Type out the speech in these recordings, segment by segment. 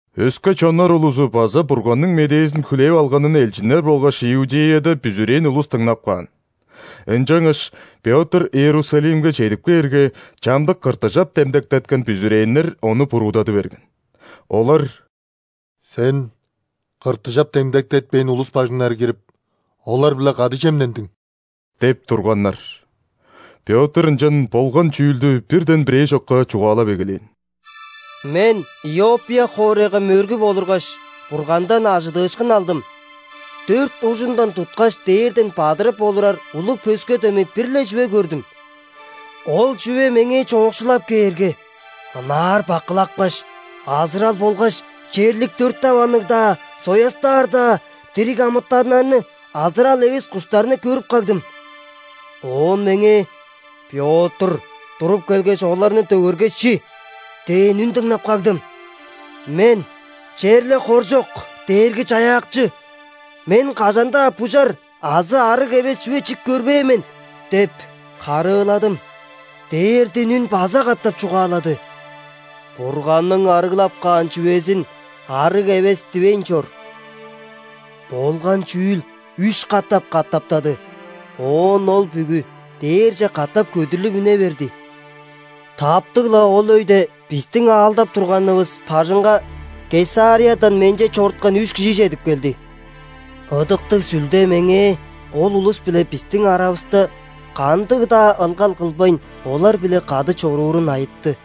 Өске чоннар улузу база Бурганның медээзин хүлээп алганын элчиннер болгаш Иудеяда бүзүрээн улус дыңнап каан. Ынчангаш, Пётр Иерусалимге чедип кээрге, чамдык ·кыртыжап демдектеткен бүзүрээннер ону буруудады берген. Олар: «Сен кыртыжап демдектетпээн улус бажыңнары кирип, олар-биле кады чемнендиң» – деп турганнар. Пётр ынчан болган чүүлдү бирден бирээ чокка чугаалап эгелээн: «Мен Иоппия хоорайга мөргүп олургаш, Бургандан ·ажыдыышкын алдым. Дөрт ужундан туткаш, дээрден бадырып олурар улуг пөске дөмей бир-ле чүве көрдүм. Ол чүве меңээ чоокшулап кээрге, ынаар бакылапкаш, азырал болгаш черлик дөрт даванныг-даа, соястаар-даа дириг амытаннарны, азырал эвес куштарны көрүп кагдым. Оон меңээ: „Пётр, туруп келгеш, оларны дөгергеш, чи“ – дээн үн дыңнап кагдым. Мен: „Черле хоржок, Дээрги-Чаяакчы! Мен кажан-даа бужар азы ·арыг эвес чүве чип көрбээн мен“ – деп харыыладым. Дээрден үн база катап чугаалады: „Бурганның арыглап каан чүвезин арыг эвес дивейн чор“. Болган чүүл үш катап катаптады. Оон ол бүгү дээрже катап көдүрлүп үне берди. Таптыг-ла ол өйде бистиң аалдап турганывыс бажыңга Кесариядан менче чоруткан үш кижи чедип келди. Ыдыктыг Сүлде меңээ ол улус биле бистиң аравыста кандыг-даа ылгал кылбайн, олар-биле кады чоруурун айытты.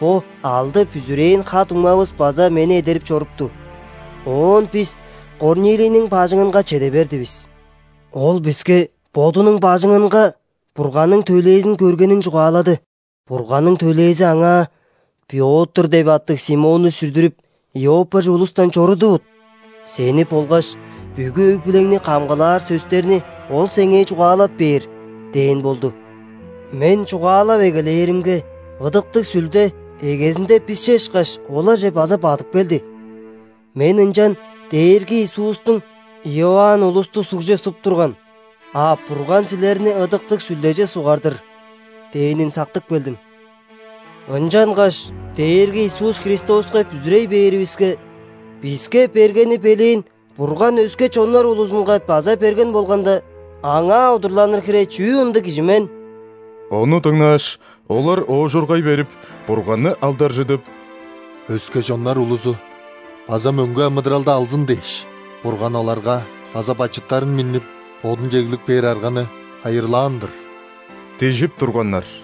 Бо алды бүзүрээн ха-дуңмавыс база мени эдерип чорупту, оон бис Корнилийниң бажыңынга чеде бердивис. Ол биске бодунуң бажыңынга Бурганның төлээзин көргенин чугаалады. Бурганның төлээзи аңаа: „Пётр деп аттыг Симонну сүрдүрүп, Иоппияже улустан чорудувут. Сени болгаш бүгү өг-бүлеңни камгалаар сөстерни ол сеңээ чугаалап бээр“ – дээн болду. Мен чугаалап эгелээримге, Ыдыктыг Сүлде, эгезинде бисче ышкаш, оларже база бадып келди. Мен ынчан Дээрги Иисустуң: „Иоанн улусту ·сугже суп турган, а Бурган силерни Ыдыктыг Сүлдеже сугар-дыр“ – дээнин сактып келдим. Ынчангаш Дээрги Иисус Христоска бүзүрей бээривиске, биске бергени белээн Бурган өске чоннар улузунга база берген болганда, Аңаа удурланыр хире чүү ындыг кижи мен?» Ону дыңнааш, олар оожургай берип, Бурганны алдаржыдып: «Өске чоннар улузу база мөңге амыдыралды алзын дээш, Бурган оларга база бачыттарын миннип, Бодунче эглип кээр арганы хайырлаан-дыр» – дижип турганнар.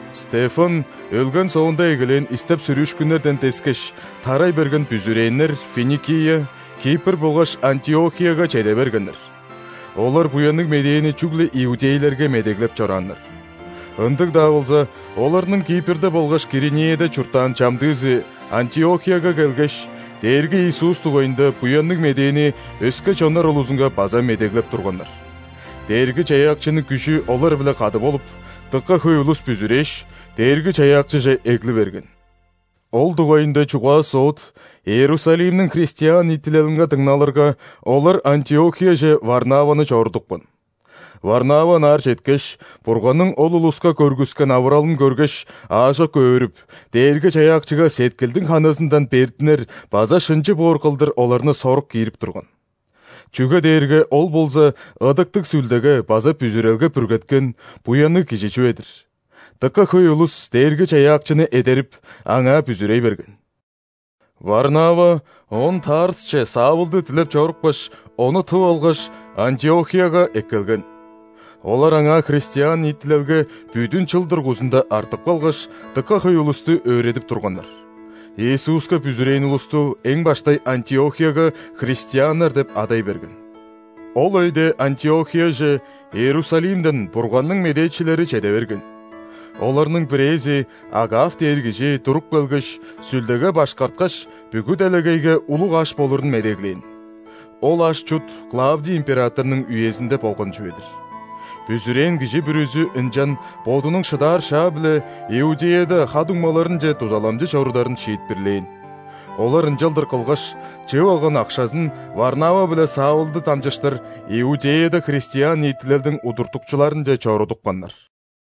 Стефан өлген соонда эгелээн истеп-сүрүүшкүннерден дескеш, тарай берген бүзүрээннер Финикия, Кипр болгаш Антиохияга чеде бергеннер. Олар Буянныг Медээни чүгле иудейлерге медеглеп чорааннар. Ындыг-даа болза, оларның Кипрде болгаш Киринеяда чурттаан чамдыызы Антиохияга келгеш, Дээрги Иисус дугайында Буянныг Медээни өске чоннар улузунга база медеглеп турганнар. Дээрги-Чаяакчының күжү олар-биле кады болуп, дыка хөй улус бүзүрээш, Дээрги-Чаяакчыже эгли берген. Ол дугайында чугаа-соот Иерусалимниң христиан ниитилелинге дыңналырга, олар Антиохияже Варнаваны чорудупкан. Варнава ынаар четкеш, Бурганның ол улуска көргүскен авыралын көргеш, аажок өөрүп, Дээрги-Чаяакчыга сеткилдиң ханызындан бердинер база шынчы боор кылдыр оларны сорук киирип турган. Чүге дээрге ол болза Ыдыктыг Сүлдеге база бүзүрелге бүргеткен, буянныг кижи чүве-дир. Дыка хөй улус Дээрги-Чаяакчыны эдерип, Аңаа бүзүрей берген. Варнава оон Тарсче Савлды дилеп чорупкаш, ону тып алгаш, Антиохияга эккелген. Олар аңаа христиан ниитилелге бүдүн чыл дургузунда артып калгаш, дыка хөй улусту өөредип турганнар. Иисуска бүзүрээн улусту эң баштай Антиохияга христианнар деп адай берген. Ол өйде Антиохияже Иерусалимден Бурганның медээчилери чеде берген. Оларның бирээзи, Агав дээр кижи, туруп келгеш, Сүлдеге башкарткаш, бүгү делегейге улуг аш болурун медеглээн (ол аш-чут Клавдий императорнуң үезинде болган чүве-дир). Бүзүрээн кижи бүрүзү ынчан бодунуң шыдаар шаа-биле Иудеяда ха-дуңмаларынче дузаламчы чорударын шиитпирлээн. Олар ынчалдыр кылгаш, чыып алган акшазын Варнава биле Савлды дамчыштыр Иудеяда христиан ниитилелдиң удуртукчуларынче чорудупканнар.